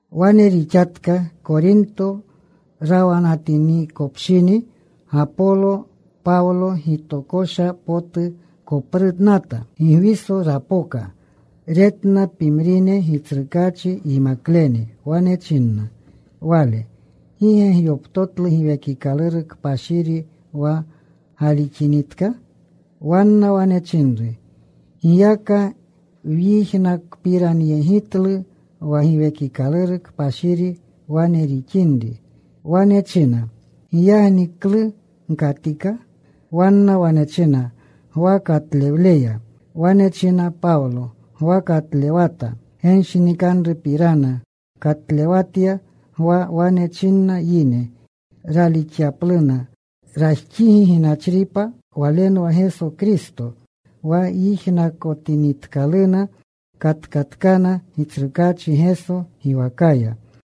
Wane rixatka. Korinto rawanatinikopshini Gapolo, Pawlo gitokosha potu koprunata. Gigwiso rapoka. Retna pimrine Gitsrukaachi yimaklene. Wane chinna wale, “¿Gi ge gyoptotlu Giwekikaluru Kpashiri wa galixinitka?” Wanna wane chinru, “Giyaka wyijnakpiranyegitlu wa Giwekikaluru Kpashiri wane rixinri.” Wane china, “¿Giyagni klu gkatika?” Wanna wane china, “Gwa katlewleya.” Wane china Pawlo, “Gwa katlewata. Genshinikanrupirana katlewatya. Gwa wane chinna yine ralixyapluna rajxigi ginachripa. Walenwa Geso Kristo.” Wa yijnakotinitkaluna katkatkana Gitsrukaachi Geso giwakaya.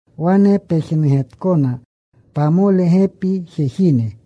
Wane pejnugetkona pamole gepi jejine.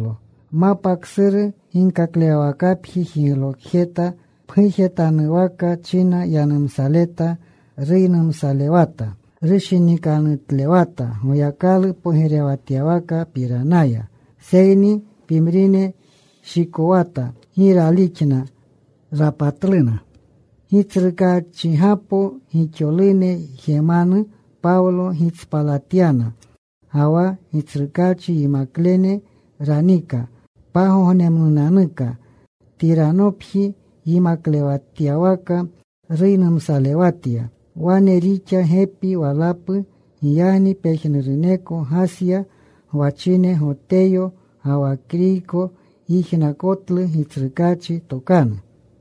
Mapa ksuru ginkaklewwakapji jiglokjeta. Pgujetanwaka china yanumsaleta. Ruynumsalewata. Rushinikanutlewata Goyakalu pogirewatywakapiranaya. Seyni pimrine shikowata. Gi ralixna. Rapatluna Gitsrukaachgapo gixolune jemanu. Pawlo gitspalatyana ga wa Gitsrukaachi yimaklene ranika. Pagognemnunanuka Tiranopji yimaklewatywaka ruynumsalewatya. Wane rixa gepi walapu. Giyagni pejnuruneko Gasya gwachine Goteyo ga wa Kriyko, yijnakotluna Gitsrukaachi tokanu.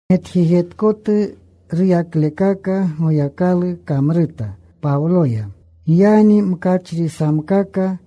Metjejetkotu ruyaklekaka Goyakalu kamruta Pawloya. Giyagni mkachrisamkaka,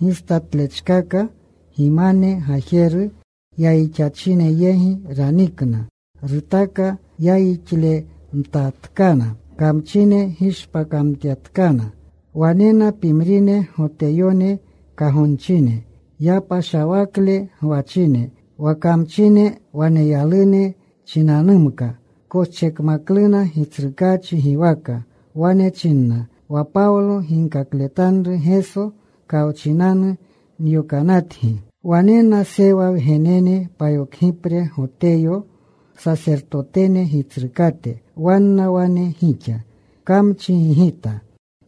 gistatlechkaka gimane gajeru yayixachine yegi ranikna. Rutuka yayixlemtatkana. Kamchine gishpakamtyatkana. Wanena pimrine Goteyone kagonchine yapashawakle gwachine. Wa kamchine waneyalune chinanumka koschekmakluna Gitsrukaachi giwaka. Wane chinna, “Wa Pawlo ginkakletanru Geso kawchinanu nyokanatgi.” Wanena Sewa wgenene payokgipre, Goteyo, sasertotene gitsrukate. Wanna wane gixa. Kamchi gigita.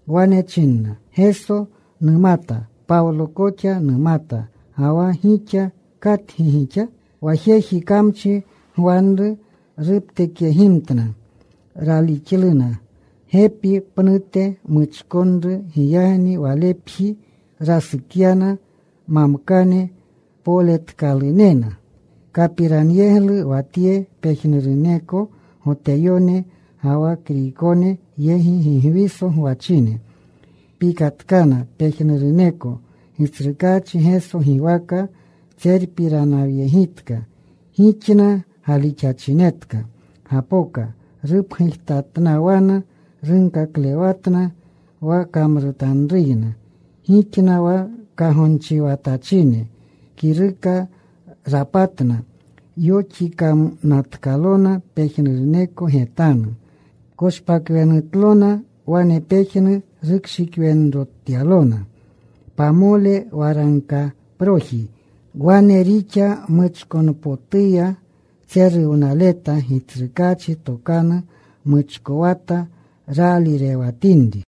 Wane china, “Geso numata. Pawlo koxa numata. Ga wa gixa, ¿katgi gixa?” Wa jeji kamchi gwanru ruptekyegimtna. Raalixna. Gepi pnute muchkonru. Giyagni walepji rasukyana mamkane poletkalunena. Kapiranyeglu wa tye pejnuruneko Goteyone ga wa Kriykone yegi Gigwiso gwachine. Pikatkana pejnuruneko. Gitsrukaachi Geso giwaka tserutpiranyegitka. Gixna galixachinetka gapoka. Rupgujtatnawana. Runkaklewatna wa kamrutanruyna. Gixna wa kagonchiwanatachine kiruka rapatna. Yoxikanatkalona pejnuruneko getanu. Koshpakwenutlona. Wane pejnu rukshikwenrotyalona: pamole waragkaproji. Wane rixa muchkonpotuya tseruwnaleta Gitsrukaachi tokanu. Muchkowata raalirewatinri.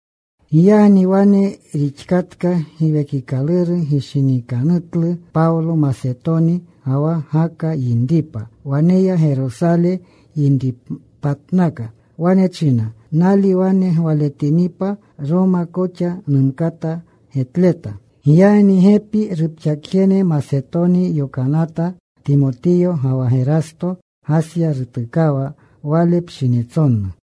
Giyagni wane rixkatka, Giwekikaluru gishinikanutlu Pawlo Masetoni ga wa Gaka yinripa. Waneya Gerosale yinripatnaka. Wane china, “Nali wane gwaletinipa, Roma koxa numkata getleta.” Giyagni gepi rupxakjene Masetoni yokanata, Timotiyo ga wa Gerasto. Gasya rutukawa wale pshinitsonu.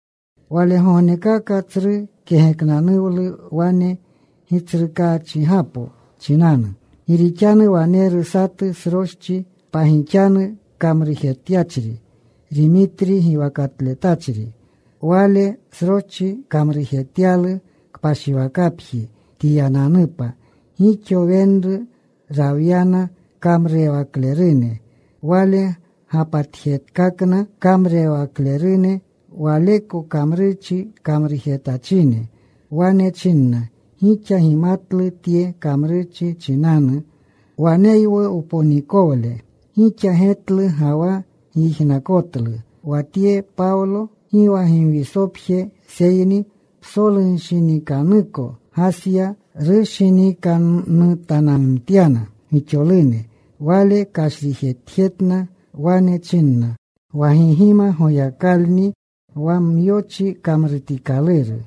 Walegognekaka tsru kegeknanuwlu wane Gitsrukaachgapo chinanu. Gi rixanu waneru satu sroschi pagixanu kamrujetyachri, Rimitri giwakatletachri. Wale sroschi kamrujetyalu kpashiwakapjiiji Tiyananupa. Gixo wenru rawyana kamrurewaklerune. Wale gapatjekakna kamrurewaklerune waleko kamrurchi kamrujetachine. Wane chinna, “Gixa gimatlu tye kamrurchi chinanu waneywu wponikowle. Gixa getlu ga wa gyijnakotlu wa tye Pawlo, gi wa Gigwisopje seyni psolunshinikanuko Gasya, rushinikanutananumtyana gixolune. Wale kashrijetjetna. Wane china wa gi gima goyakalunni wa myochi kamrutikaluru.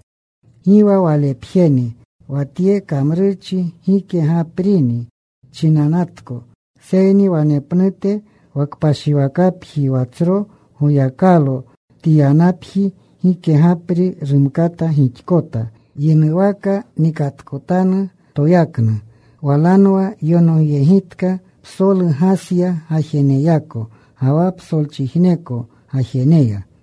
Gi wa walepjeni wa tye kamrurchi gike gaprini chinanatko, seyni wanepnute wa kpashiwakapji wa tsro goyakalo Tiyanapji gike gapri rumkata gixkota. Yinuwaka nikatkotanu toyaknu. Walanwa yonogyegitka psolu Gasya gajeneyako, ga wa psolchijneko gajeneya.”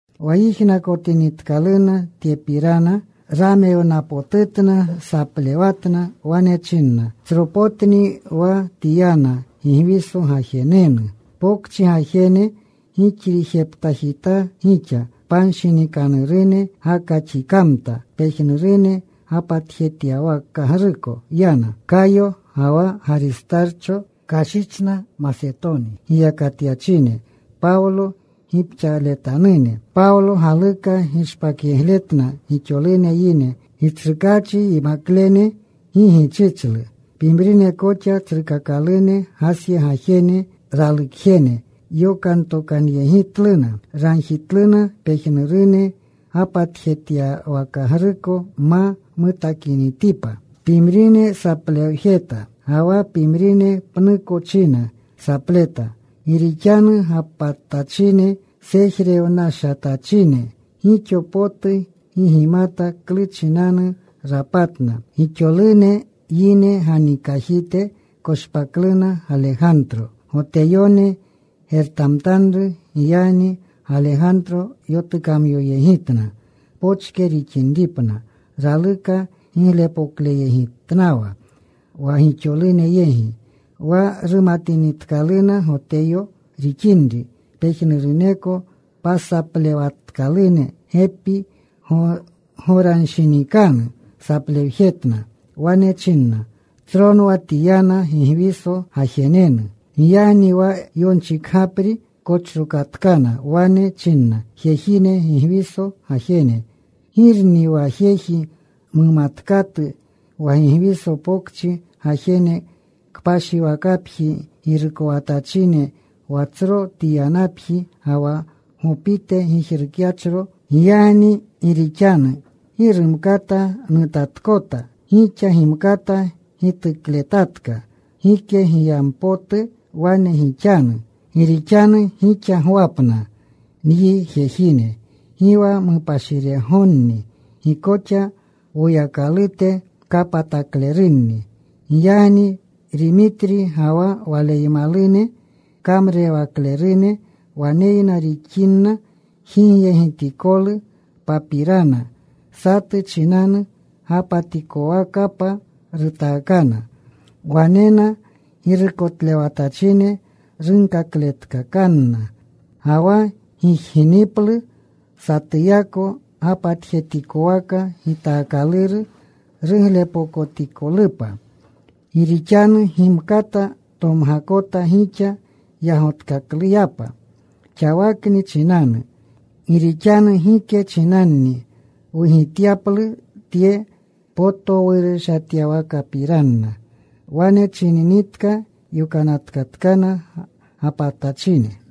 Wa yijnakotinitkaluna tyepirana, ramewnapotutna. Saplewatna. Wane chinna, “Tsropotni wa Tiyana, Gigwiso gajenenu.” Pokchi gajene gixrijeptajitaa gixa. Panshinikanurune gakaxikamta. Pejnurune gapatjetyawakagruko yana. Kayo ga wa Garistarcho kashichna, Masetoni giyakatyachine, Pawlo gipxaaletanune. Pawlo galuka gishpakyegletna gixolune yine. Gitsrukaachi yimaklene gi gichichlu. Pimrine koxa tsrukakalune Gasya gajene, ralukjene, yokantokanyegitluna. Ragjitluna pejnurune gapatjetyawakagruko ma mutakinitipa. Pimrine saplewjeta, ga wa pimrine pnuko china sapleta. Gi rixanu gapatachine sejrewnashatachine. Gixo potu gi gimata klu chinanu rapatna. Gixolune yine ganikajite koshpakluna Galegantro. Goteyone gertamtanru. Giyagni Galegantro yotukamyoyegitna pochke rixinripna. Raluka giglepokleyegitnawa wa gixolune yegi. Wa rumatinitkaluna Goteyo rixinri, pejnuruneko pasaplewatkalune. Gepi goranshinikanu saplewjetna. Wane chinna, “Tsronwa Tiyana Gigwiso gajenenu.” Giyagni wa yonchikgapri kochrokatkana. Wane china, “Jejine, Gigwiso gajene, ¿girni wa jeji mumatkatu wa Gigwiso Pokchi gajene kpashiwakapji girukotachine wa tsro Tiyanapji, ga wa Gopite gijrukyachro. Giyagni gi rixanu gi rumkata nutatkota, gixa gimkata gitukletatka. Gike giyampotu wane gixanu. Gi rixanu gixa gwapna nyi jejine. Gi wa mupashiregonni. Gi koxa woyakalote kapataklerunni. Giyagni Rimitri ga wa waleymalune kamrurewaklerune waneyna rixinna jijyegitikolu papirana satu chinanu, gapatikowakapa rutakanna. Wanena girukotlewatachine. Runkakletkakanna. Ga wa gijginiplu satuyako, gapatjetikwaka gitaakaluru ruglepokotikolupa. Gi rixanu gimkata tomgakota gixa yagotkakluyapa xawakni chinanu. Gi rixanu gike chinanni wugityaplu tye potowurushatyawakapirana.” Wane chininitka, yokanatatkana gapatachine.